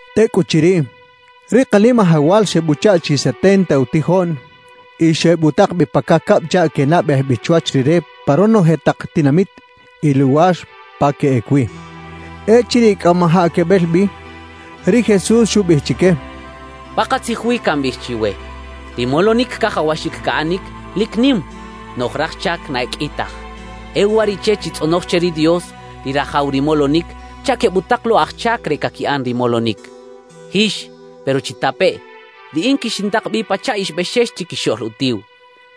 Tecꞌuchiriꞌ, ri Kanimajawal xebuchaꞌ chi setenta utijoꞌn y xebutak bi pa cacab chaꞌ quenabej bi chwach Rire pa ronoje tak tinamit y luwar pa queꞌec wi. Echiriꞌ cꞌamajaꞌ quebel bi, ri Jesús xubiꞌij chique: «Pakatzij wi cambiꞌij chiwe: Ri molonic cajawaxic caꞌanic, lic nim; noꞌj raj chac na e qꞌui taj. E uwariꞌche chitzꞌonoj che ri Dios, ri Rajaw ri molonic, chaꞌ quebutak lo aj chac re caquiꞌan ri molonic. ¡Jix! Pero chitapeꞌ: Riꞌin quixintak bi pachaꞌ ix bexex chiquixoꞌl utiw.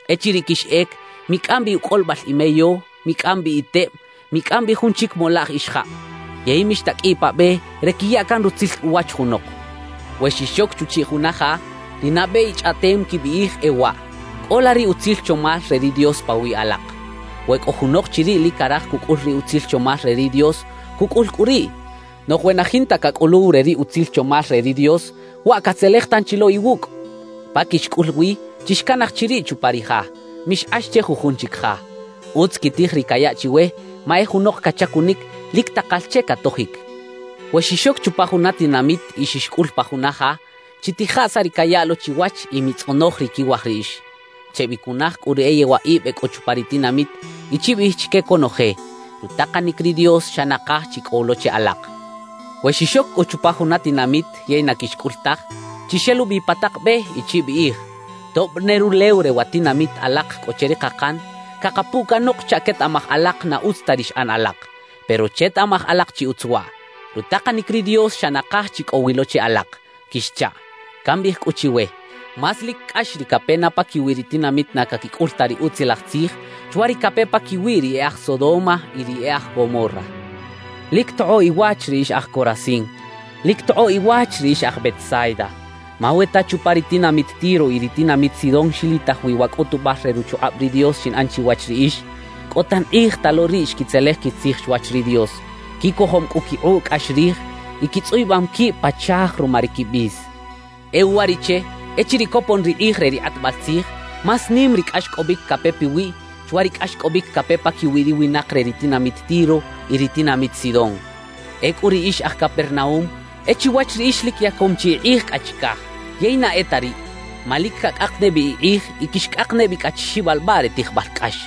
»Echiriꞌ quixꞌec, micꞌam bi ucꞌolibal imeyo, micꞌam bi iteb, micꞌam bi jun chic molaꞌj ixajab. Yey mixtaqꞌuiꞌ pa be re quiya can rutzil uwach junok. »We xixoc chuchiꞌ juna ja, ri nabe ichꞌaꞌtem quibiꞌij e waꞌ: “Cꞌola ri utzil chomal re ri Dios pawiꞌ alak.” We cꞌo junok chiriꞌ lic caraj cucꞌul ri utzil chomal re ri Dios, cucꞌul cꞌu riꞌ. Noꞌj we na jinta cacꞌuluw re ri utzil chomal re ri Dios, waꞌ catzelej tanchi lo iwucꞌ. Pa quixcꞌul wi, chixcanaj chiriꞌ chupa ri ja; mixkꞌax che jujun chic ja. Utz quitij ri cayaꞌ chiwe; ma e junok cachacunic, lic takal che catojic. We xixoc chupa juna tinamit y xixcꞌul pa juna ja, chitijaꞌ saꞌ ri cayaꞌ lo chiwach y mitzꞌonoj ri quiwaj riꞌix. »Chebicunaj cꞌu ri e yewaꞌib e cꞌo chupa ri tinamit y chibiꞌij chique conoje: “Rutakanic ri Dios xa nakaj chi cꞌo wi lo che alak.” »We xixoc cꞌu chupa juna tinamit yey na quixcꞌul taj, chixelubi pa tak be y chibiꞌij: “Tob ne rulew re wa tinamit alak cꞌo che ri kakan, cakapuꞌ canok chaꞌ quetaꞌmaj alak na utz ta ri xꞌan alak. Pero chetaꞌmaj alak chi utz waꞌ: Rutakanic ri Dios xa nakaj chi cꞌo wi lo che alak” quixchaꞌ. Cambiꞌij cꞌu chiwe: Más lic cꞌax ri cape na paquiwi ri tinamit na caquicꞌul ta ri Utzilaj Tzij, chwa ri cape paquiwi ri e aj Sodoma y ri e aj Gomorra. »¡Lic tokꞌoꞌ iwach ri ix aj Corazín! ¡Lic tokꞌoꞌ iwach ri ix aj Betsaida! Ma we ta chupa ri tinamit Tiro y ri tinamit Sidón xilitaj wi wa cꞌutubal re ruchukꞌab ri Dios xinꞌan chiwach riꞌix, cꞌo tan kꞌij ta lo riꞌ xquitzelej quitzij chwach ri Dios, quicojom cꞌu quikꞌuꞌ cꞌax rij y quitzꞌuyubam quib pa chaaj ruma ri quibis. E uwariꞌche echiriꞌ copon ri kꞌij re ri kꞌatbal tzij, más nim ri cꞌaxcꞌobic cape piwiꞌ chwa ri cꞌaxcꞌobic cape paquiwi ri winak re ri tinamit Tiro y ri tinamit Sidón. Ecꞌu ri ix aj Capernaúm, e chiwach riꞌix lic yacom chi ikꞌij cꞌa chicaj; yey na e ta riꞌ, ma lic cacꞌak ne bi ikꞌij y quixcꞌak ne bi cꞌa chi xibalbaꞌ re tijbal cꞌax.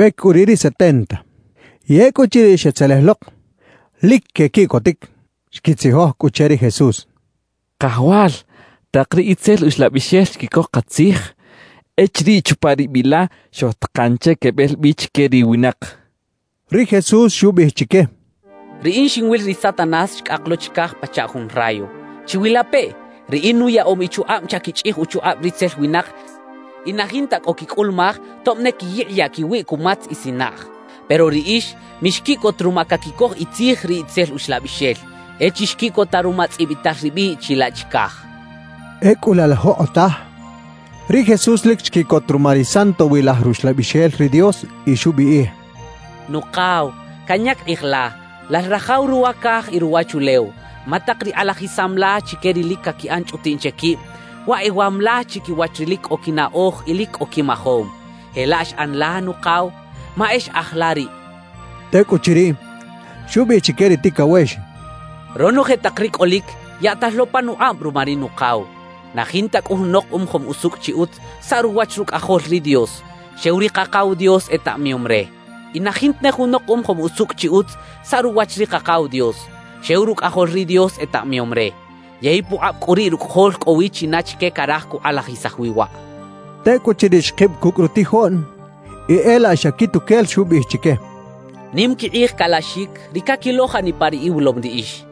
Xebec cꞌu riꞌ ri setenta. Y ecꞌuchiriꞌ xetzelej lok, lic quequiꞌcotic. Xquitzijoj cꞌu che ri Jesús: —Kajawal, ¡tak ri itzel uxlabixel xquicoj katzij echiriꞌ chupa ri biꞌ la xojtakan che quebel bi chique ri winak! —xechaꞌ. Ri Jesús xubiꞌij chique: —Riꞌin xinwil ri Satanás xcꞌak lo chicaj pachaꞌ jun rayo. ¡Chiwilapeꞌ! Riꞌin nuyaꞌom ichukꞌab chaꞌ quichꞌij uchukꞌab ritzel winak y na jinta cꞌo quicꞌulumaj tob ne quiyikꞌiyaꞌ quiwiꞌ cumatz y sinaꞌj. Pero riꞌix mixquiꞌcot ruma caquicoj itzij ri itzel uxlabixel; e chixquiꞌcota ruma tzꞌibital ribiꞌ chilaꞌ chicaj —xchaꞌ. Ecꞌu laꞌ la jokꞌotaj, ri Jesús lic xquiꞌcot ruma ri Santowilaj Ruxlabixel ri Dios y xubiꞌij: «Nukaw, canyac kꞌij la, Lal Rajaw ruwa caj y ruwachulew, ma tak ri kꞌalajisam la chique ri lic caquiꞌan chꞌutiꞌn che quib, waꞌ ewam la chiquiwach ri lic cꞌo quinaꞌoj y lic cꞌo quimajom. Jelaꞌ xꞌan la, Nukaw, ma e xꞌaj la riꞌ» xchaꞌ. Tecꞌuchiriꞌ, xubiꞌij chique ri ticawex: «Ronoje tak ri cꞌolic yaꞌtal lo panukꞌab ruma ri Nukaw. Na jinta cꞌu junok umajom usucꞌ chi utz saꞌ ruwach Rucꞌajol ri Dios; xew ri Kakaw Dios etaꞌmayom re. Y na jinta ne junok umajom usucꞌ chi utz saꞌ ruwach ri Kakaw Dios, xew Rucꞌajol ri Dios etaꞌmayom re; yey pukꞌab cꞌu riꞌ Rucꞌajol cꞌo wi china chique caraj cukꞌalajisaj wi waꞌ» xchaꞌ. Tecꞌuchiriꞌ xkib cucꞌ rutijoꞌn y e laꞌ xa quituquel xubiꞌij chique: «Nim quikꞌij calaxic ri caquilo janipa ri iwilom riꞌix.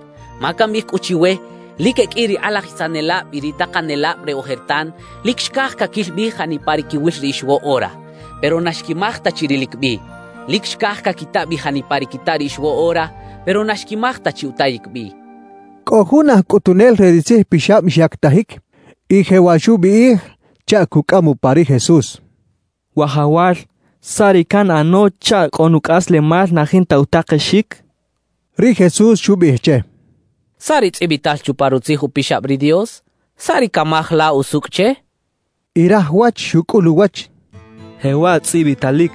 Ma cambiꞌij cꞌu chiwe lic e qꞌui ri kꞌalajisanelab y ri takanelab re ojertan lic xcaj caquil bi janipa ri quiwil riꞌix woꞌora, pero na xquimaj ta chi rilic bi. Lic xcaj caquita bi janipa ri quita riꞌix woꞌora, pero na xquimaj ta chi utayic bi» xchaꞌ. Cꞌo jun aj cꞌutunel re ri tzijpixab xyactajic y jewaꞌ xubiꞌij chaꞌ cucꞌam upa ri Jesús: —Wajawal, ¿saꞌ ri canꞌano chaꞌ cꞌo nucꞌaslemal na jinta utakexic? —xchaꞌ. Ri Jesús xubiꞌij che: —¿Saꞌ ri tzꞌibital chupa Rutzij Upixab ri Dios? ¿Saꞌ ri camaj la usucꞌ che? —xchaꞌ. Y raj wach xucꞌul uwach: —Jewaꞌ tzꞌibitalic: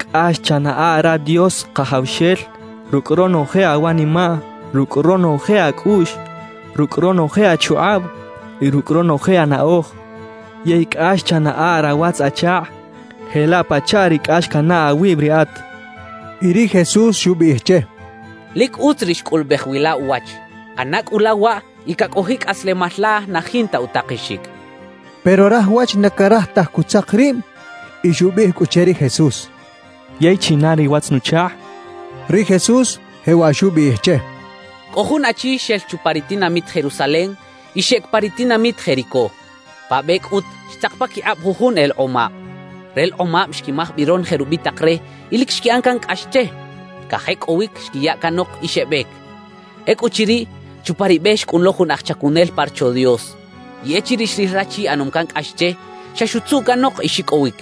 Cꞌax chanaꞌa ra Dios Kajawxel rucꞌ ronoje awanimaꞌ, rucꞌ ronoje acꞌuꞌx, rucꞌ ronoje achukꞌab y rucꞌ ronoje anaꞌoj; yey Cꞌax chanaꞌa rawatz-achakꞌ jelaꞌ pachaꞌ ri cꞌax canaꞌ awib riꞌat —xchaꞌ. Y ri Jesús xubiꞌij che: —Lic utz ri xcꞌulubej wi la uwach. ꞌAna cꞌu la waꞌ y cacꞌojiꞌ cꞌaslemal la na jinta utakexic —xchaꞌ. Pero raj wach na caraj taj cutzak rib y xubiꞌij cꞌu che ri Jesús: —¿Yey china ri watz-nuchakꞌ? —xchaꞌ. Ri Jesús jewaꞌ xubiꞌij che: «Cꞌo jun achi xel chupa ri tinamit Jerusalem y xeꞌec pa ri tinamit Jericó. Pa be cꞌut xtzak paquikꞌab jujun elekꞌomab. Relekꞌomab xquimaj bi ronoje rubitak re y lic xquiꞌan can cꞌax che. Cajecꞌowic xquiya canok y xebec. »Ecꞌuchiriꞌ, chupa ri be xcꞌun lo jun aj chacunel pa Rocho Dios. Y echiriꞌ xril rachi ꞌanom can cꞌax che, xa xutzuꞌ canok y xicꞌowic.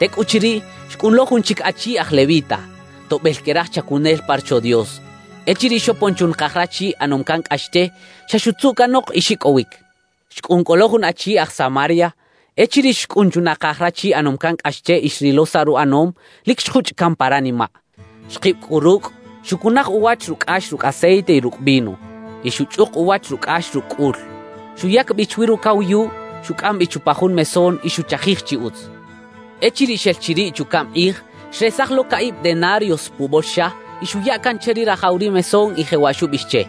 »Tecꞌuchiriꞌ xcꞌun lo jun chic achi aj levita, toꞌbel que raj chacunel pa Rocho Dios. Echiriꞌ xopon chunakaj rachi ꞌanom can cꞌax che, xa xutzuꞌ canok y xicꞌowic. »Xcꞌun cꞌu lo jun achi aj Samaria. Echiriꞌ xcꞌun chunakaj rachi ꞌanom can cꞌax che y xrilo saꞌ ruꞌanom, lic xjuchꞌ caꞌn pa ranimaꞌ. Xkib cꞌu rucꞌ, xucunaj uwach rucꞌax rucꞌ aceite y rucꞌ vino, y xuchꞌuk uwach rucꞌax rucꞌ cꞌul. Xuyac bi chwi rucawayuꞌ, xucꞌam bi chupa jun mesón y xuchajij chi utz. Echiriꞌ xel chiriꞌ chucaꞌm kꞌij, xresaj lo caꞌib denarios pubolxa y xuya can che ri rajaw ri mesón, y jewaꞌ xubiꞌij che: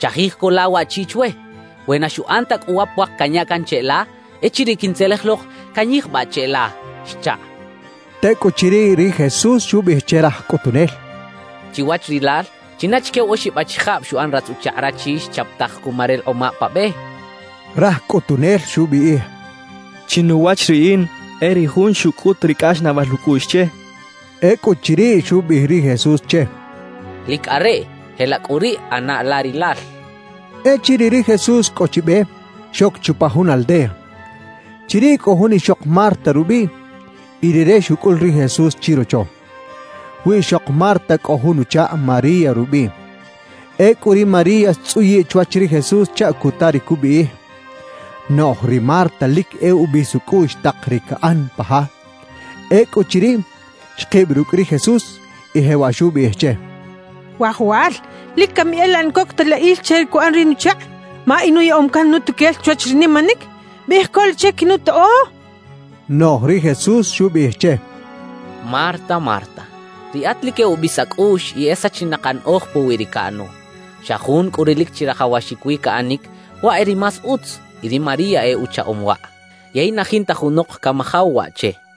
“Chajij co la waꞌchi chwe. We na xuꞌan ta cꞌu wa puak canya can cheꞌla, echiriꞌ quintzelej lok, canyijbaꞌ cheꞌla” xchaꞌ.» Tecꞌuchiriꞌ ri Jesús xubiꞌij che raj cꞌutunel: —Chiwach rilal, ¿china chique wa oxib achijab xuꞌan ratz-uchakꞌ rachi xchapataj cuma relekꞌomab pa be? —xchaꞌ. Raj cꞌutunel xubiꞌij: —Chinuwach riꞌin, e ri jun xucꞌut ri cꞌaxnaꞌbal ucꞌuꞌx che —xchaꞌ. Ecꞌuchiriꞌ xubiꞌij ri Jesús che: —Lic areꞌ. Jelaꞌ cꞌu riꞌ ꞌana la rilal —xchaꞌ. Echiriꞌ ri Jesús cꞌo chi be, xoc chupa jun aldea. Chiriꞌ cꞌo jun ixok Marta rubiꞌ y rire xucꞌul ri Jesús chirocho. Wiꞌxok Marta cꞌo jun uchakꞌ María rubiꞌ. Ecꞌu ri María xtzꞌuyiꞌ chwach ri Jesús chaꞌ cuta ri cubiꞌij. Noꞌj ri Marta lic e ubis ucꞌuꞌx tak ri caꞌan pa ja. Ecꞌuchiriꞌ, xkib rucꞌ ri Jesús y jewaꞌ xubiꞌij che: —Wajawal, ¿lic cami e laꞌ na coc ta la il che ri cuꞌan ri nuchakꞌ? Ma inuyaꞌom can nutuquel chwach ri nimanic. Biꞌij co la che quinutoꞌo —xchaꞌ. Noꞌj ri Jesús xubiꞌij che: —Marta, Marta, riꞌat lic e ubis acꞌuꞌx y e sachinak anaꞌoj puwi ri caꞌano. Xa jun cꞌu ri lic chirajawaxic wi caꞌanic, waꞌ e ri más utz, y ri María e uchaꞌom waꞌ; yey na jinta junok camajaw waꞌ che —xchaꞌ.